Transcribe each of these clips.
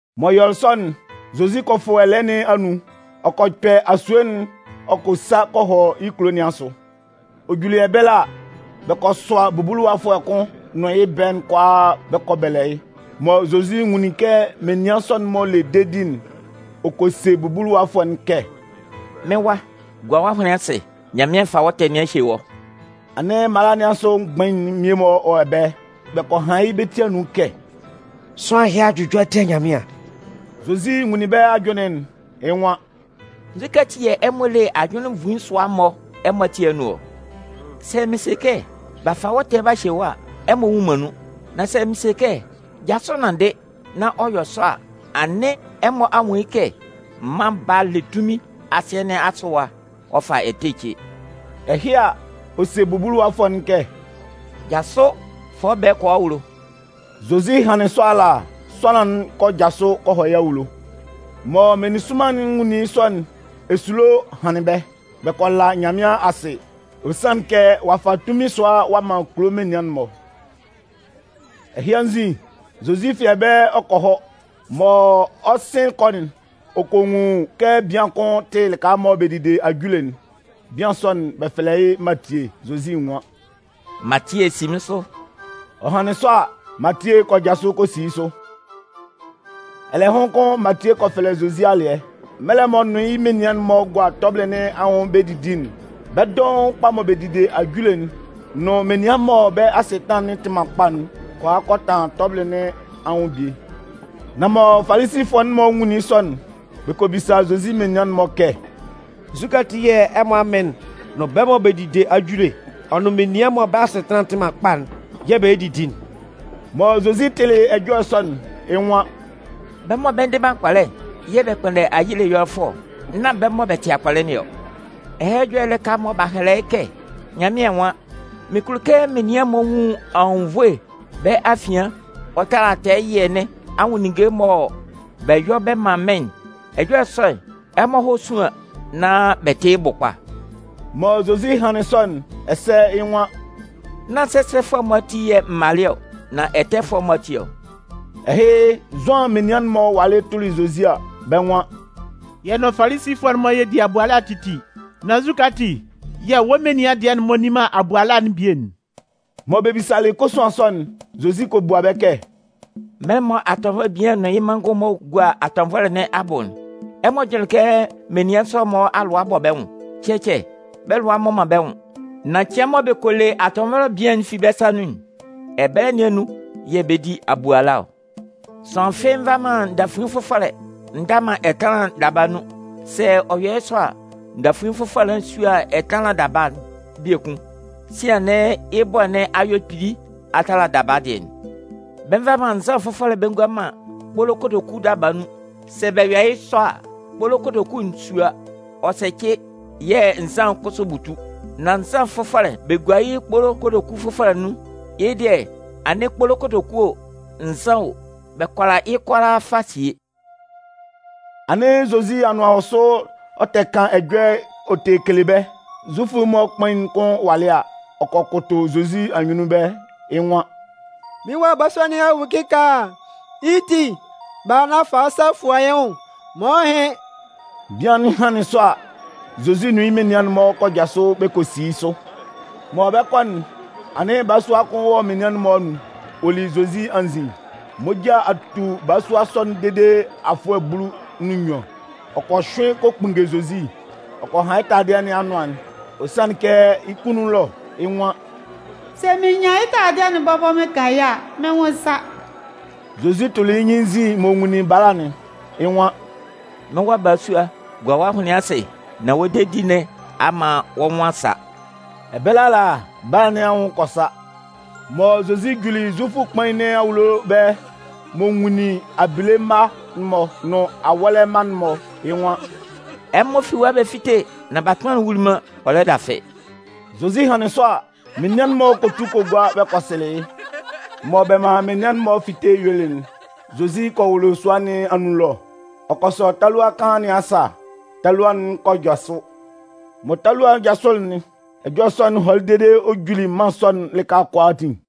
M'ɔ yɔlɩ sɔ'n, Zozi kɔ fʋ ɛlɛɛ nɩn anun, ɔ kɔ kpɛ asue'n ɔ kɔ sa kɔ hɔ yɩ́ kulo nɩn asʋ. Ɔ juli ɛbɛlɛ a, bɛ kɔ sʋa bubuluwafʋɛ kʋn nʋn yɩ́ ɛbɛɛ'n kʋalaa bɛ kɔ bɛlɛ yɩ́. Mɔ Zozi nwunlin kɛ menian sɔ'n-mɔ le dedi'n, ɔ kɔ se bubuluwafʋɛ'n kɛ: “Mɩ́n wa, gua wɔ́ ahʋnlɩn asɩ. Nyanmɩan a fa wɔ́ ɛtɛ nɩn a hye wɔ́.” Anɩn mala nɩn asʋ mgbain'n mmie-mɔ wɔ ɛbɛlɛ. Bɛ kɔ han yɩ́ bɛ́ ti anun kɛ: “Sʋanlan ɛhɩ a jʋjɔ a tia Nyanmɩan.” Zozi nwunlin bɛ́ ajʋnlɩn'n. Yɩ́ nwan: “Nzukɛ ati yɛ̂ ɛmɔ le ajʋnlɩn nvuin sʋa-mɔ ɛmɔ ati anun ɔ? Sɛ mɩn se kɛ: ‘B'a fa wɔ́ ɛtɛ'n b'a hye wɔ́’ a, ɛmɔ nnwun man nun. Nan sɛ mɩn se kɛ: ‘Jasʋ nanndɩ’, nán ɔ yɔ sɔ a, anɩn ɛmɔ a nwun yɩ́ kɛ Mân Baa'n le tunmin asɩɛ nɩn asʋ ɛwa, ɔ fa ɛtɛ ce.” Ɛhɩ a, ɔ se bubuluwafʋɛ'n kɛ: “Jasʋ, fa wɔ́ ɛbɛɛ'n kɔ wɔ́ awulo!” Zozi hanlɩn sɔ ala, sʋanlan'n kɔ jasʋ ɔ kɔ hɔ yɩ́ awulo. Mɔ meninsʋnman'n nwunlin yɩ́ sɔ'n, esulo hanlɩn bɛ́. Bɛ́ kɔ la Nyanmɩan asɩ, ɔ sanlɩn kɛ ɔ'a fa tunmin sʋa ɔ'a man kulo menian'n-mɔ. Ɛhɩ anzin, Zozi fi ɛbɛlɛ ɔ kɔ hɔ. Mɔ ɔ 'sɩn kɔ'n, ɔ kɔ nwun kɛ bian kʋn tɩ lɩka mɔ bɛ dide ajule'n. Bian sɔ'n, bɛ fɛlɛ yɩ́ Matie. Zozi nwan: “Matie, si mɩ́n sʋ!” Ɔ hanlɩn sɔ a, Matie kɔ jasʋ kɔ si yɩ́ sʋ. Ɛlɛhʋn kʋn Matie kɔ fɛlɛ Zozi alɩɛ. Mɛlɛ m'ɔ nʋn yɩ́ menian'n-mɔ bɛ gua tɔbɩlɩ nɩn anwʋn bɛ 'didi'n, bɛ́ dɔʋn mɔ bɛ dide ajule'n, nʋn menian mɔ bɛ́ asɩtanlan'n tɩ man kpa'n kɔ a kɔ tɛtanlan tɔbɩlɩ nɩn anwʋn bie. Nan mɔ Falisifʋɛ'n-mɔ nwunlin yɩ́ sɔ'n, bɛ kɔ bisa Zozi menian'n-mɔ kɛ: “Nzukɛ ati yɛ̂ ɛmɔ amɩn'n nʋn bɛ́ mɔ bɛ dide ajule, ɔ nʋn menian mɔ bɛ́ asɩtanlan tɩ man kpa'n yɛ̂ bɛ lɛ didi'n?” Mɔ Zozi tɩlɩ ɛjɔlɛ sɔ'n, yɩ́ nwan: “Bɛ́ mɔ bɛ ndɩ man akpɔlɛ'n yɛ̂ bɛ kpʋnndɛ ayile ɛyɔlɛfʋɛ ɔ, nan nán bɛ́ mɔ bɛ tɩ akpɔlɛ nɩn ɔ. Ɛhɛlɛ Ɛjɔlɛ'n lɩka mɔ b'a hɛlɛ yɩ́ kɛ Nyanmɩan nwan: Mɩn kulo kɛ menian'n-mɔ nwun anwunnvoe bɛ́ afian ɔ tala tɛɛ ɛyɩɛ nɩn anwʋn ninnge'n mɔ bɛ yɔ bɛ man mɩ́n'n. Ɛjɔlɛ sɔ'n, ɛmɔ hɔ́ súan nán bɛ tɩ́ yɩ́ bʋ kpa.” Mɔ Zozi hanlɩn sɔ'n, ɛsɛ yɩ́ nwan: “Nán sɛsɛfʋɛ'n-mɔ ati yɛ̂ m malɩ ɔ, nan ɛtɛfʋɛ'n-mɔ ati ɔ.” Ɛhɩ, Zʋan menian'n-mɔ walɩ tʋlɩ Zozi a, bɛ́ nwan: “Yɛ nʋn Falisifʋɛ'n-mɔ yɛ di abuala titi. Nan nzukɛ ati yɛ̂ wɔ́ menian dɩɛ'n-mɔ nni man abuala'n bie'n?” Mɔ bɛ bisalɩ kosuan sɔ'n, Zozi kɔ bua bɛ́ kɛ: “Mɛlɛ mɔ atɔnvɔlɛ bian'n nʋn yɩ́ manngʋn-mɔ gua atɔnvɔlɛ nɩn abʋ'n, ɛmɔ jʋnlɩn kɛ menian sɔ'n-mɔ alʋa 'bɔ bɛ́ nwʋn? Cɛcɛ, bɛ́ lʋa mmɔ man bɛ́ nwʋn. Nan cɩan mɔ bɛ kɔ le atɔnvɔlɛ bian'n fi bɛ́ sa nun'n, ɛbɛlɛ nɩn anun yɛ̂ bɛ 'di abuala ɔ. “Sʋanlan fɩ́ɩ́ nva man ndafuin fʋfɔlɛ nda man ɛtanlan daba nun. Sɛ ɔ yɔ yɩ́ sɔ a, ndafuin fʋfɔlɛ'n 'sua ɛtanlan daba'n biekun. Sian anɩn yɩ́ bɔɛ nɩn a yɔ kpili a tala daba dɩɛ'n. Bɛ nva man nzan fʋfɔlɛ bɛ ngua man kpolo kotoku daba nun. Sɛ bɛ yɔ yɩ́ sɔ a, kpolo kotoku'n 'sua ɔ sɛcɩ yɛ̂ nzan'n kʋsʋ 'butu. Nan nzan fʋfɔlɛ'n, bɛ gua yɩ́ kpolo kotoku fʋfɔlɛ nun. Yɩ́ dɩɛ anɩn kpolo kotoku o, nzan o, bɛ kʋala yɩ́ kʋalaa fa sie.” Anɩn Zozi anʋan wɔ sʋ ɔ tɛ kan ɛjɔlɛ ɔ tɛ kele bɛ́. Zufʋ'n-mɔ kpain'n kʋn walɩ a, ɔ kɔ kʋtʋ Zozi anyunnun ɛbɛlɛ, yɩ́ nwan: “Mɩ́n wa balasua nɩn a wu kɩkaala. Yɩ́ ti, bala nán fa wɔ́ sa fua yɩ́ nwʋn maan ɔ hɩ́n.” Bian'n hanlɩn sɔ a, Zozi nʋn yɩ́ menian'n-mɔ kɔ jasʋ bɛ kɔ si yɩ́ sʋ. Mɔ bɛ 'kɔ'n, anɩn balasua kʋn wɔ menian'n-mɔ anun, ɔ li Zozi anzin. Moja a tu balasua sɔ'n dede afʋɛ bulu nʋn nnyuan. Ɔ kɔ hyʋɩn kɔ kpunnge Zozi, ɔ kɔ han yɩ́ taladɩɛ nɩn anʋan'n. Ɔ sanlɩn kɛ yɩ́ kunnun ɛlɔ, yɩ́ nwan: “Sɛ mɩn nyan yɩ́ taladɩɛ'n bɔbɔ mɩn kan yɩ́ a, mɩ́n nwʋn 'sa.” Zozi tʋlɩ yɩ́ nyɩn yɩ́ nzin m'ɔ nwunlin bala'n, yɩ́ nwan: “Mɩ́n wa balasua, gua wɔ́ ahʋnlɩn asɩ, nán wɔ́ dedi nɩn a man wɔ́ nwʋn a sa.” Ɛbɛlɛ ala, bala nɩn anwʋn kɔ sa. Mɔ Zozi juli Zufʋ kpain nɩn awulo ɛbɛlɛ m'ɔ nwunlin abile mma'n-mɔ nʋn awɔ́lɛ mma'n-mɔ'n, yɩ́ nwan: “Ɛmɔ fi ɛwa bɛ fíte, nán batʋnman'n wuli man, ɔ lɛ dafɩ.” Zozi hanlɩn sɔ a, menian'n-mɔ kɔ tu kɔ gua bɛ kɔ sɩlɩ yɩ́. Mɔ bɛ manlɩn menian'n-mɔ fitelɩ yuelɩ'n, Zozi kɔ wʋlʋ sua nɩn anun ɛlɔ, ɔ kɔ sɔ talua kaan nɩn asa, talua'n kɔ jasʋ. Mɔ talua'n jasʋlɩ'n, ɛjɔlɛ sɔ'n hɔlɩ dede ɔ juli mân sɔ'n lɩka kʋalaatin.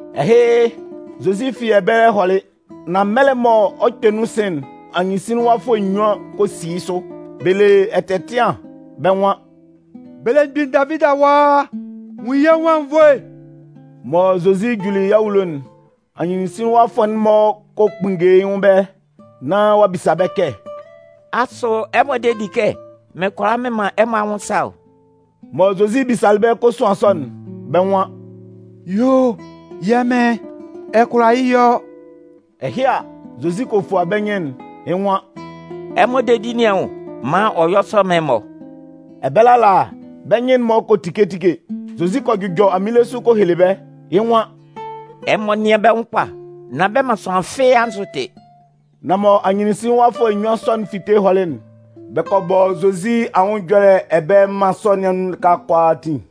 Ɛhɩ, Zozi fi ɛbɛlɛ hɔlɩ, nan mɛlɛ mɔ ɔ 'kpɛ nun sɩn'n, anyɩnsinlinwafʋɛ nnyuan kɔ si yɩ́ sʋ, bɛ le ɛtɛtɩan. Bɛ́ nwan: “Belemgbin Davidi awa, nwun yɛ́ nwʋn anwunnvoe!” Mɔ Zozi juli yɩ́ awulo'n, anyɩnsinlinwafʋɛ'n-mɔ kɔ kpunnge yɩ́ nwʋn ɛbɛlɛ, nán ɔ'a bisa bɛ́ kɛ: “Asʋ ɛmɔ de di kɛ mɩn kʋala mɩn man ɛmɔ anwʋn sa ɔ?” Mɔ Zozi bisalɩ bɛ́ kosuan sɔ'n, bɛ́ nwan: “Yuo o! Yɛ́ Mɩn, ɛ kʋala yɩ́ yɔ.” Ɛhɩ a, Zozi kɔ fua bɛ́ nyɩn'n, yɩ́ nwan: “Ɛmɔ dedi nɩn anwʋn, man ɔ yɔ́ sɔ mán ɛmɔ!” Ɛbɛlɛ ala, bɛ́ nyɩn'n-mɔ kɔ tike tike. Zozi kɔ jʋjɔ aminle sʋ kɔ hele bɛ́, yɩ́ nwan: “Ɛmɔ tíe yɩ́ kpa, nán bɛ man sʋanlan fɩ́ɩ́ anzʋ tɩ.” Nan mɔ anyɩnsinlinwafʋɛ nnyuan sɔ'n fi ɛbɛlɛ hɔlɩ'n, bɛ kɔ bɔ Zozi anwʋn ɛjɔlɛ ɛbɛlɛ mân sɔ nɩn anun lɩka kʋalaatin.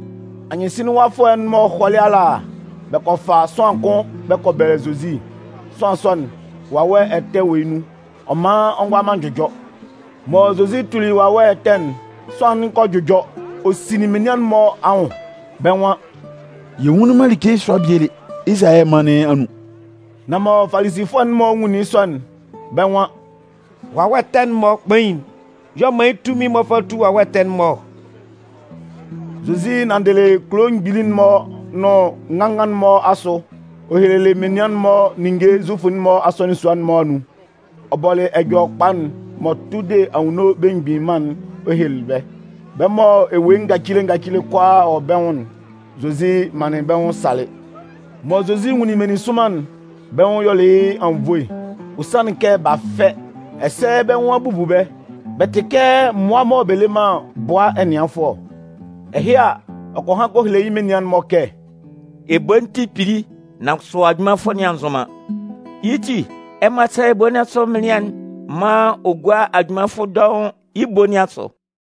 Anyɩnsinlinwafʋɛ'n-mɔ hɔlɩ ala, bɛ kɔ fa sʋanlan kʋn bɛ kɔ bɛlɛ Zozi. Sʋanlan sɔ'n, wawɛ ɛtɛ wɔ yɩ́ nun, ɔ man ɔ ngʋala man jʋjɔ. Mɔ Zozi tuli wawɛ ɛtɛ'n, sʋanlan'n kɔ jʋjɔ. Ɔ sinlin menian'n-mɔ anwʋn. Bɛ́ nwan: “Yɛ nwunlin man like sʋa bie lé Izalayɛ mân nɩn anun!” Nan mɔ Falisifʋɛ'n-mɔ nwunlin yɩ́ sɔ'n, bɛ́ nwan: “Wawɛ ɛtɛ'n-mɔ kpain'n y'ɔ man yɩ́ tunmin m'ɔ fa tu wawɛ ɛtɛ'n-mɔ ɔ.” Zozi nanndɩlɩ kulo mgbili'n-mɔ ɔ nʋn ngangan'n-mɔ asʋ, ɔ hehelɩ menian'n-mɔ ninnge Zufʋ'n-mɔ asɔnɩn sua'n-mɔ anun. Ɔ bɔlɩ Ɛjɔlɛkpa'n m'ɔ tʋ de Anwunno Belemgbin Mân'n ɔ helelɩ bɛ́. Bɛ́ mɔ ewue ngacile ngacile kʋalaa wɔ bɛ́ nwʋn'n, Zozi manlɩn bɛ́ nwʋn salɩ. Mɔ Zozi nwunlin meninsʋnman'n, bɛ́ nwʋn yɔlɩ yɩ́ anwunnvoe. Ɔ sanlɩn kɛ b'a fɛ, ɛsɛ bɛ́ nwʋn a bubu bɛ́. Bɛ tɩ kɛ mmʋa mɔ bɛ le man bʋa ɛnɩanfʋɛ ɔ. Ɛhɩ a, ɔ kɔ han kɔ hele yɩ́ menian'n-mɔ kɛ: “Ebo'n tɩ kpili, nan kʋsʋ ajunmanfʋ'n-mɔ a nzʋn man. Yɩ́ ti, ɛmɔ sɛ́lɛ ebo nɩn asʋ mɩnlɩan'n maan ɔ gúa ajunmanfʋ dɔʋn yɩ́ ebo nɩn asʋ.”